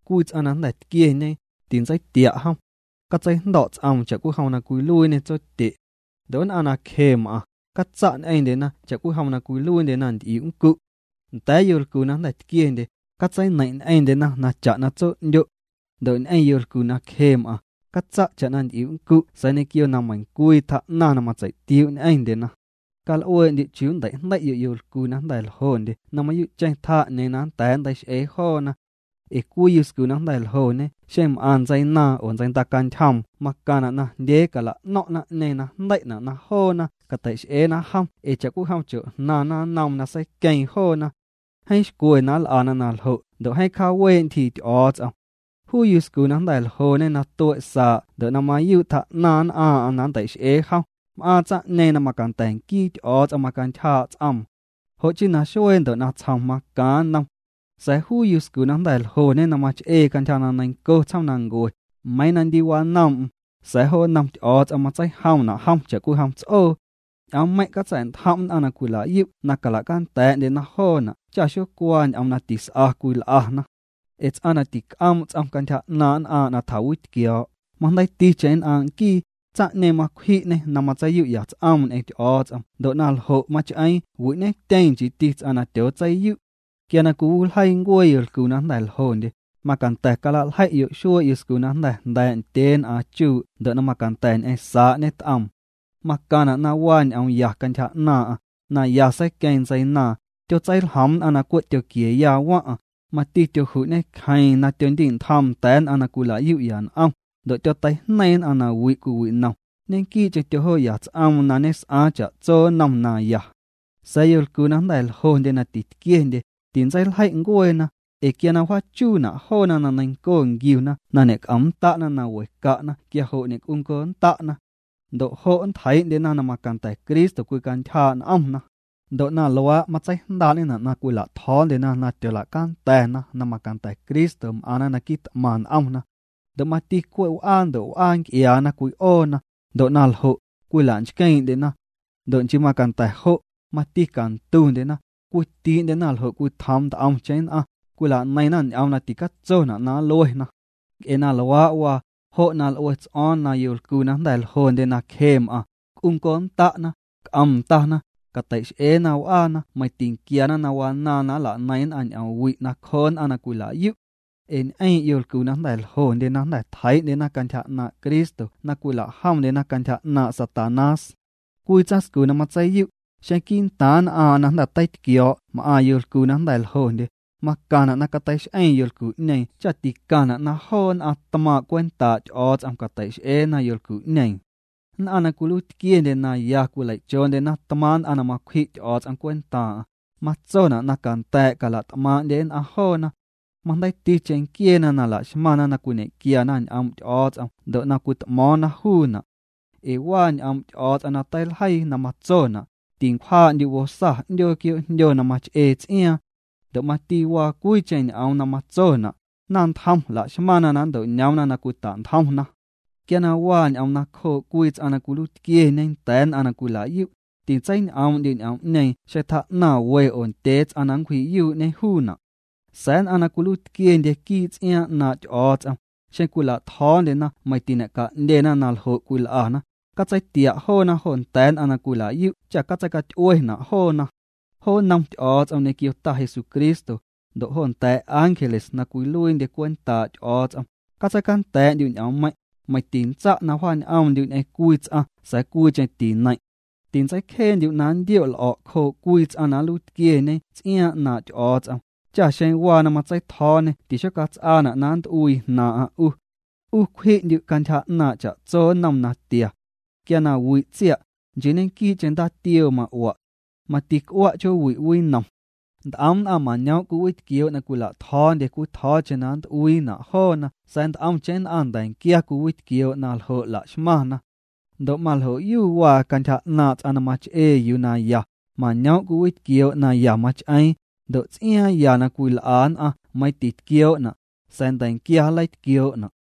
Cwii ts'aⁿ na jnda̱ tquieñe, tintseitia' jom. Catseijndo̱' ts'oom cha'cwijom na cwiluiiñe tsotye'. Ndo' nn'aⁿ na cje m'aⁿ, catsa' ñ'eⁿndyena cha'cwijom na cwiluiindyena nt'iu' nncu'. Nda̱a̱ yolcu na jnda̱ tquiendye, catseineiⁿ' ñ'eⁿndyena na cha'na tso'ndyo'. Ndo' ñ'eⁿ yolcu na cje m'aⁿ, catsa' na cha'na nt'iu' nncu' sa̱a̱ ñequio na meiⁿcwii tjaa'naⁿ na matseitiuu' ñ'eⁿndyena. Cal'uee'ndyu' chiuu nntei'jndei'yo' yolcu na jnda̱ ljondye na mayuu'cheⁿ tjaa 'ñeeⁿ na nnda̱a̱ nntei'x'ee joona. Ee cwii yuscu na jnda̱ ljoñe xeⁿ m'aⁿ ntseinaaⁿ oo ntseindacantyjoom macaⁿna' najndyee cala'no̱ⁿ' naⁿ'ñeeⁿ na jndei'na' na joona catei'x'eena jom ee cha'cwijom chojnaⁿna nnoom na seiqueeⁿ joona. Jeeⁿ xcwe na nl'ana na ljo' ndo' cjaawee' ntyjii Ty'o̱o̱ts'om. Juu yuscu na jnda̱ ljoñe na tue' saa' ndo' na mayuu' tjaa'naⁿ nn'aaⁿ'aⁿ na nntei'x'ee jom, m'aaⁿ tsaⁿ'ñeeⁿ na macanda̱ nquii Ty'o̱o̱ts'om na macantyjaa' ts'oom. Jo' chii naxuee ndo' natsjom macaaⁿ nnom. Sa̱a̱ yuscu na jnda̱ ljoñe na mach'ee cantyja na neiⁿnco tsjoomnancuee, meiiⁿ na ndi wanoom'm, sa̱a̱ jo nnom Ty'o̱o̱ts'om matseijomna' jom cha'cwijom ts'oo. Ñ'oommeiⁿ' catsa̱'ntjom' nn'aⁿ na cwila'yu' na cala'canda̱a̱'ndyena joona' cha xocuaa ñ'oom na tis'a cwil'ana. Ee ts'aⁿ na tic'oom' ts'om cantyja 'naaⁿ' nn'aaⁿ' na tjawitquio̱o̱', majndeiiticheⁿ nn'aaⁿ' nquii, tsaⁿ'ñeeⁿ macwji'ñê na matseiyu'ya ts'oom ñ'eⁿ Ty'o̱o̱ts'om ndo' na ljo' mach'eeⁿ wi'ñetyeeⁿ nchiiti ts'aⁿ na tyootseiyu'. Quia cwiwiljeii ncuee yolcu na jnda̱ ljondye, macanda̱ cala'ljei'yo' xuee' yuscu na jnda̱ jnda̱a̱' ndyeen'aaⁿ chuu' ndo' na macanda̱ ñ'eⁿ saa' ñet'oom. Macaⁿna' na waa ñ'oomya cantyja 'naaⁿ'aⁿ, na ya seiqueeⁿ ntseinaaⁿ, tyotseiljoom nn'aⁿ na cwe' tyoquieya waⁿ'aⁿ, mati tyoju'ñe cjeeⁿ na tyondi'ntjoom nda̱a̱ nn'aⁿ na cwila'yu'ya n'om, ndo' tyoteijneiⁿ nn'aⁿ na wi' cwiwinom, ñequii'cheⁿ tyojoo'ya ts'oom na ñes'aaⁿ cha'tso nnom naya. Sa̱a̱ yolcu na jnda̱ ljondye na titquiendye, tintseiljei' ncueena, ee quia na wjaachuuna' joona na neiⁿnco nquiuna na ñec'omnnda'na na we ca'na quia jo' ñe'c'unconnda'na. Ndo' jo' nntjeii'ndyena na macanda̱ Cristo cwicantyjaa' n'omna. Ndo' na luaa', matseijndaa'ñena' na cwila'tjo̱o̱ndyena na tyoola'canda̱na na macanda̱ Cristo m'aⁿna na quit'maⁿ n'omna. Ndo' mati cwe' w'aa ndo' w'aa nc'iaana cwi'oona, ndo' na ljo', cwila'nchqueeⁿ'ndyena. Ndo' nchii macanda̱ jo', mati cantundyena, cwitii'ndyena ljo' cwitjoom nt'omcheⁿ nn'aⁿ, cwila'neiⁿna ñ'oom na ticatsona' na nluena. Nc'e na luaa' waa, jo' na l'ue ts'o̱o̱ⁿ na yolcu na jnda̱ ljondye na cje m'aⁿna, c'unconnda'na, c'om ndana, cateix'eena w'aana meiⁿ tinquiana na wanaaⁿ na nla'neiⁿ nn'aⁿ ñ'oom wi' nacjoo nn'aⁿ na cwila'yu'. Ee ñ'eeⁿ' yolcu na jnda̱ ljondye na jnda̱ tjeii'ndyena cantyja 'naaⁿ' Cristo na cwilajomndyena cantyja ñaaⁿ' Satanás. Cwii tsaⁿscu na matseiyu', xeⁿ quii'ntaaⁿ nn'aaⁿ'aⁿ na jnda̱ teitquio̱o̱' m'aⁿ yolcu na jnda̱ ljondye, macaⁿna' na cateix'eeⁿ yolcu'ñeeⁿ cha ticaⁿna' na joo nn'aⁿ tmaaⁿ' cwentaa' Ty'o̱o̱ts'om cateix'eena yolcu'ñeeⁿ. Nn'aⁿ na cwiluiitquiendye na ya cwilei'choondyena tmaaⁿ' nn'aⁿ na macwji' Ty'o̱o̱ts'om cwentaaⁿ'aⁿ, matsona' na canda̱a̱' cala't'maaⁿ'ndye nn'aⁿ joona. Majndeiiticheⁿ nquieena na laxmaⁿna na cwiñequiana ñ'oom' Ty'o̱o̱ts'om ndo' na cwit'mo̱o̱ⁿna juuna'. Ee waa ñ'oom' Ty'o̱o̱ts'om na teiljeii na matsona': “Tincwjaa'ndyu' bosa 'ndyoo quioo'jndyo na mach'ee ts'iaaⁿ.” Ndo' mati waa cwiicheⁿ ñ'oom na matsona': “Naⁿntjom laxmaⁿna na nnto'ñoomna na cwitantjomna.” Quia na waa ñ'oom nacjoo' cwii ts'aⁿ na cwiluiitquieñe nda̱a̱ nn'aⁿ na cwila'yu', tintseiñ'oom'ndyu' ñ'oom'ñeeⁿ xeⁿ tjaa'naⁿ we oo ndyee ts'aⁿ na nncwji'yuu'ñe juuna'. Sa̱a̱ nn'aⁿ na cwiluiitquiendye quii' ts'iaaⁿ 'naaⁿ' Ty'o̱o̱ts'om, xeⁿ cwila'tjo̱o̱ndyena meiⁿ tiñe'ca'ndyena na ljo' cwil'ana, catseitia' joona jo nda̱a̱ nn'aⁿ na cwila'yu' cha' catseicaty'uena' joona. Jo nnom Ty'o̱o̱ts'om ñequio Ta Jesucristo, ndo' jo nda̱a̱ ángeles na cwiluiindye cwentaa' Ty'o̱o̱ts'om, catseicanda̱a̱'ndyu' ñ'oommeiⁿ', meiⁿ tintsa' na wja'ñ'oomndyu' ñ'eⁿ cwii ts'aⁿ sa̱a̱ cwiicheⁿ tineiⁿ'. Tintseicjeendyu' na nndio' l'o̱' cjoo' cwii ts'aⁿ na nluiitquieñe ts'iaaⁿ 'naaⁿ' Ty'o̱o̱ts'om, cha xeⁿ waa na matseitjo̱o̱ñê tixocats'aana' na nnt'uii jnaaⁿ'aⁿ 'u. 'U cwji'ndyu' cantyja 'naaⁿ' cha'tso nnom natia. Quia na wi' tsia', nchii ñequii'cheⁿ ndaatioo ma'ua'. Mati c'ua' chjoowi' winom. Nt'om nn'aⁿ mañoom' cwiwitquioo' na cwila'tjo̱o̱ndye cwii tjo̱o̱cheⁿ na nnt'uiina' joona sa̱a̱ nt'omcheⁿ nn'aⁿ nda̱nquia cwiwitquioo' naljo' laxmaⁿna. Ndo' maljo'yu waa cantyja 'naaⁿ' ts'aⁿ na mach'ee yuu naya, mañoom' cwiwitquioo' na ya mach'eeⁿ, ndo' ts'iaaⁿ ya na cwil'a nn'aⁿ meiiⁿ titquioo'na', sa̱a̱ nda̱nquia nleitquioo'na'.